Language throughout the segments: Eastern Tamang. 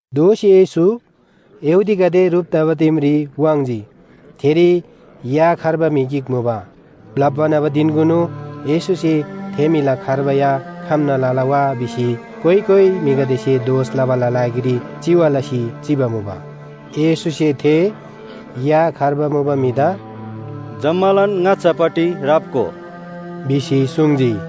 दोःसी येशू यहूदीगदे ह्रुप तबा दिमरी वाङ्‌जी। थेरी या खर्बा म्‍हि गिक मुबा। ब्‍लप्‍बा न्‍हबा धिनकुनु येशूसे थे म्‍हिला खर्बा या खम्‍ना लला वा भिसी कोइ कोइ म्‍हिगदेसे दोष लबाला लागिरी चिवा लसी चिबा मुबा। येशूसे थे या खर्बा मुबा म्‍हिदा “जम्‍मालान ङाच्‍छापट्टि राप्‍गो” भिसी सुङ्जी।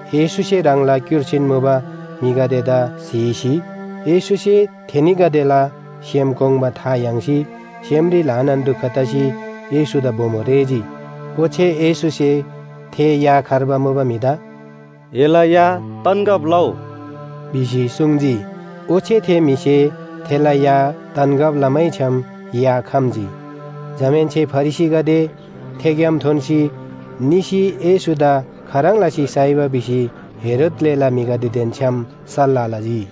येशूसे ह्राङला क्‍युर्सीन मुबा म्‍हिगदेदा स्‍हीसी येशूसे थेनीगदेला सेम कोङ्बा था याङ्सी सेमरी ल्‍हानान दुख तसी येशूदा बोमो रेःजी। ओच्‍छे येशूसे थे या खर्बा मुबा म्‍हिदा “एला या तन्‍गब लउ” भिसी सुङ्जी। ओच्‍छे थे म्‍हिसे थेला या तन्‍गब लमैछ्‌याम या खम्‍जी। जमाहेन्‍से फरिसीगदे थेग्‍याम थोन्‍सी निसी येशूदा खाह्रङ् लसी साइबा भिसी हेरोद ग्‍लेला म्‍हिगदेदेन छ्‌याम सल्‍लाह लजी।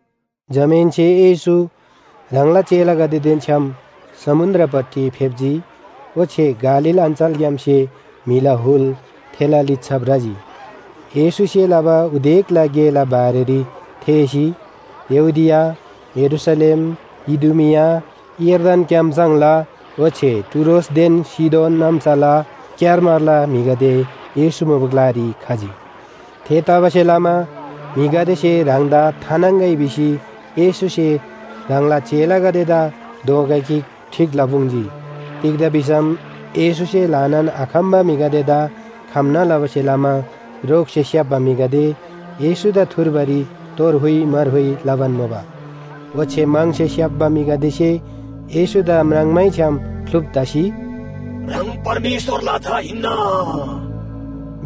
जमाहेन्‍से येशू ह्राङला चेलागदेदेन छ्‌याम समुन्‍द्रपट्टि फेप्‍जी, ओच्‍छे गालील अञ्‍चलग्‍यामसे म्‍हिला हुल थेला लिच्‍छा भ्रजी। येशूसे लबा उदेकला गेला बारेरी थेःसी यहूदिया, यरूशलेम, इदुमिआ, यर्दन क्‍याम्‍सङ्‍ला ओच्‍छे टुरोसदेन सीदोन नाम्‍साला क्‍यारमारला म्‍हिगदे येशू मुबा ग्‍लारी खजी। थेतबासेलमा म्‍हिगदेसे ह्राङदा थानाङ्‍गै भिसी येशूसे ह्राङला चेलागदेदा दोँगा गिक ठीक लपुङ्जी। तिग्‍दा भिसम येशूसे ल्‍हानान आखम्‍बा म्‍हिगदेदा खम्‍ना लबासे लमा रोगसे स्‍याप्‍बा म्‍हिगदे येशूदा थुर्बारी तोर हुइ मार हुइ लबान मुबा। ओच्‍छे म्‍हङसे स्‍याप्‍बा म्‍हिगदेसे येशूदा म्राङ्मैछ्‍याम ख्‍लुप तसी, “ह्राङ परमेश्‍वरला झा हिन्‍ना”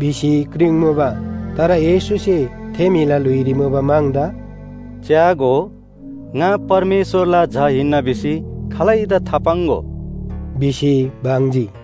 भिसी क्रिङ्मुबा। तर येशूसे थे म्‍हिला ल्‍हुइरी मुबा म्‍हङदा “च्‍यागो, ङा परमेश्‍वरला झा हिन्‍ना भिसी खालैदा थापाङ्‍गो” भिसी बङ्जी।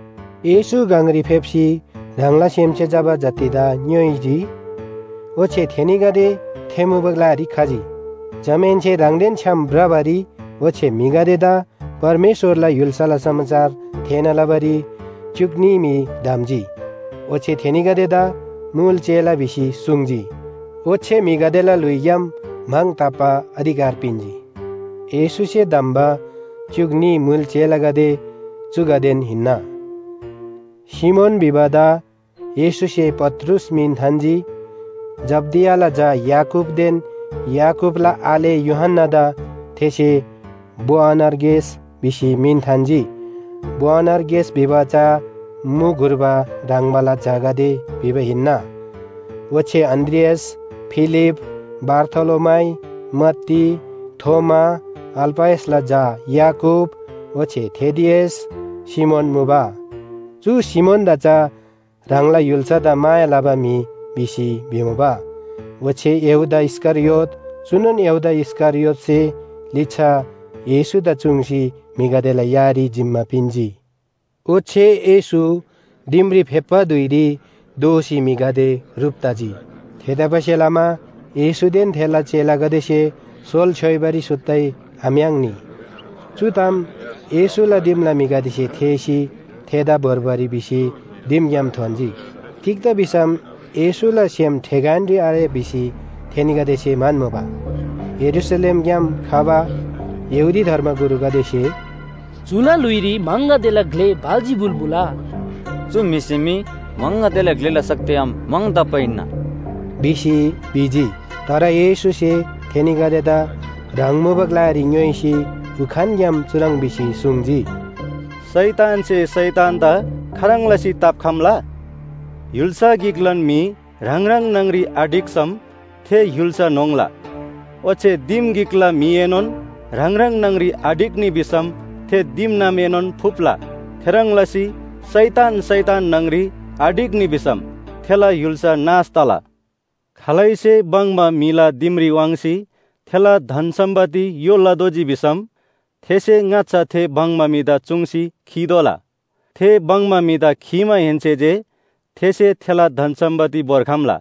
येशू गङरी फेप्‍सी ह्राङला सेमसे चबा जतिदा ङ्‌योइजी, ओच्‍छे थेनीगदे थे मुबा ग्‍लारी खजी। जमाहेन्‍से ह्राङदेन छ्‌याम भ्रबारी ओच्‍छे म्‍हिगदेदा परमेश्‍वरला य्‍हुल्‍साला समाचार थेःना लबारी च्‍युक न्‍ही म्‍हि धम्‍जी, ओच्‍छे थेनीगदेदा मुल चेला भिसी सुङ्जी। ओच्‍छे म्‍हिगदेला ल्‍हुइग्‍याम म्‍हङ ताप्‍बा अधिकार पिन्‍जी। येशूसे धम्‍बा च्‍युक न्‍ही मुल चेलागदे चुगदेन हिन्‍ना, सिमोन भिबादा येशूसे पत्रुस मिन थान्‍जी। जब्‍दियाला झा याकूबदेन याकूबला आले यूहन्‍नादा थेसे बोअनर्गेस भिसी मिन थान्‍जी। बोअनर्गेस भिबा चा मु घुर्बा ह्रङ्बाला झागदे भिबा हिन्‍ना। ओच्‍छे अन्‍द्रियास, फिलिप, बारथोलोमाइ, मत्ती, थोमा, अल्‍फयसला झा याकूब, ओच्‍छे थेदियस, सिमोन मुबा। चु सिमोनदा चा ह्राङला य्‍हुल्‍सादा माया लबा म्‍हि भिसी भिमुबा। ओच्‍छे यहूदा इस्‍करियोत चुनोन यहूदा इस्‍करियोतसे लिच्‍छा येशूदा चुङ्सी म्‍हिगदेला यारी जिम्‍मा पिन्‍जी। ओच्‍छे येशू दिमरी फेप्‍बा धुइरी दोःसी म्‍हिगदे ह्रुप तजी। थेतबासेलमा येशूदेन थेला चेलागदेसे सोल छ्‌योइबारी सुत्तै आम्‍याङ्नी। चु ताम येशूला दिमला म्‍हिगदेसे थेःसी थेदा भोर्बारी भिसी दिमग्‍याम थोन्‍जी, तिग्‍दा भिसम येशूला सेम ठेगानरी आरे भिसी थेनीगदेसे म्‍हन्‍मुबा। यरूशलेमग्‍याम खबा यहूदी धर्मगुरुगदेसे, “चुला ल्‍हुइरी म्‍हङगदेला ग्‍ले बालजिबुल मुला, चु म्‍हिसे मी म्‍हङगदेला ग्‍लेला शक्तिग्‍याम म्‍हङ ताप्‍बा हिन्‍ना” भिसी भिजी। तर येशूसे थेनीगदेदा ह्राङ मुबा ग्‍लारी ङ्‌योइसी उखानग्‍याम चुह्रङ् भिसी सुङ्जी, “शैतानसे शैतानदा खाह्रङ् लसी ताप्‍खम्‍ला? य्‍हुल्‍सा गिकलान म्‍हि ह्राङ ह्राङ न्‍हङरी आढिक्‍सम थे य्‍हुल्‍सा न्‍होङ्ला। ओच्‍छे दिम गिकला म्‍हिएनोन ह्राङ ह्राङ न्‍हङरी आढिक्‍नी भिसम थे दिमनामएनोन फुप्‍ला। थेह्रङ् लसी शैतान शैतान न्‍हङरी आढिक्‍नी भिसम थेला य्‍हुल्‍सा नाश तला। खालैसे भङ्‍बा म्‍हिला दिमरी वाङ्सी थेला धन सम्‍पत्ति य्‍हो लतोःजी भिसम थेसे ङाच्‍छा थे भङ्‍बा म्‍हिदा चुङ्सी खीतोःला। थे भङ्‍बा म्‍हिदा खीमाहेन्‍से जे थेसे थेला धन सम्‍पत्ति भोर्खम्‍ला।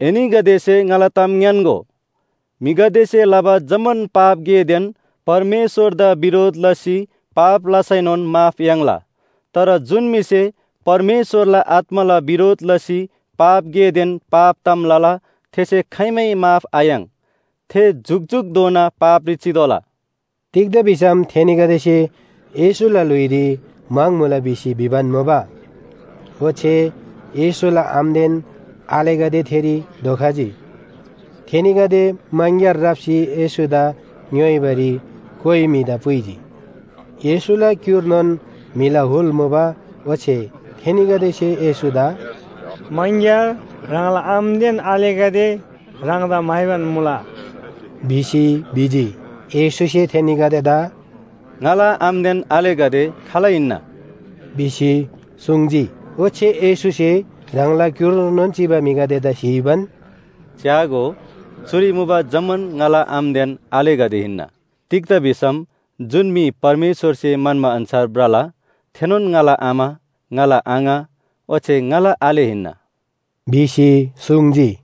“एनीगदेसे ङाला ताम ङ्‌यान्‍गो, म्‍हिगदेसे लबा जम्‍मान पाप गेदेन परमेश्‍वरदा बिरोध लसी पाप लसैनोन माफ याङ्ला। तर जुन म्‍हिसे परमेश्‍वरला आत्‍माला बिरोध लसी पाप गेदेन पाप ताम लला, थेसे खाइमै माफ आयाङ्। थे जुकजुकधोना पापरी चितोःला।” तिग्‍दा भिसम थेनीगदेसे येशूला ल्‍हुइरी म्‍हङ मुला भिसी भिबान मुबा। ओच्‍छे येशूला आमादेन आलेगदे थेरी धोखजी। थेनीगदे मङग्‍यार राप्‍सी येशूदा ङ्‌योइबारी कोइ म्‍हिदा पुइजी। येशूला क्‍युर्नोन म्‍हिला हुल मुबा ओच्‍छे थेनीगदेसे येशूदा “मङग्‍यार ह्राङला आमादेन आलेगदे ह्राङदा म्‍हाइबान मुला” भिसी भिजी। येशूसे थेनीगदेदा “ङाला आमादेन आलेगदे खाल हिन्‍ना?” भिसी सुङ्जी। ओच्‍छे येशूसे ह्राङला क्‍युर्नोन चिबा म्‍हिगदेदा स्‍हीबान, “च्‍यागो, चुरी मुबा जम्‍मान ङाला आमादेन आलेगदे हिन्‍ना। तिग्‍दा भिसम जुन म्‍हि परमेश्‍वरसे म्‍हन्‍बा अन्‍छार भ्रला थेनोन ङाला आमा, ङाला आङा ओच्‍छे ङाला आले हिन्‍ना” भिसी सुङ्जी।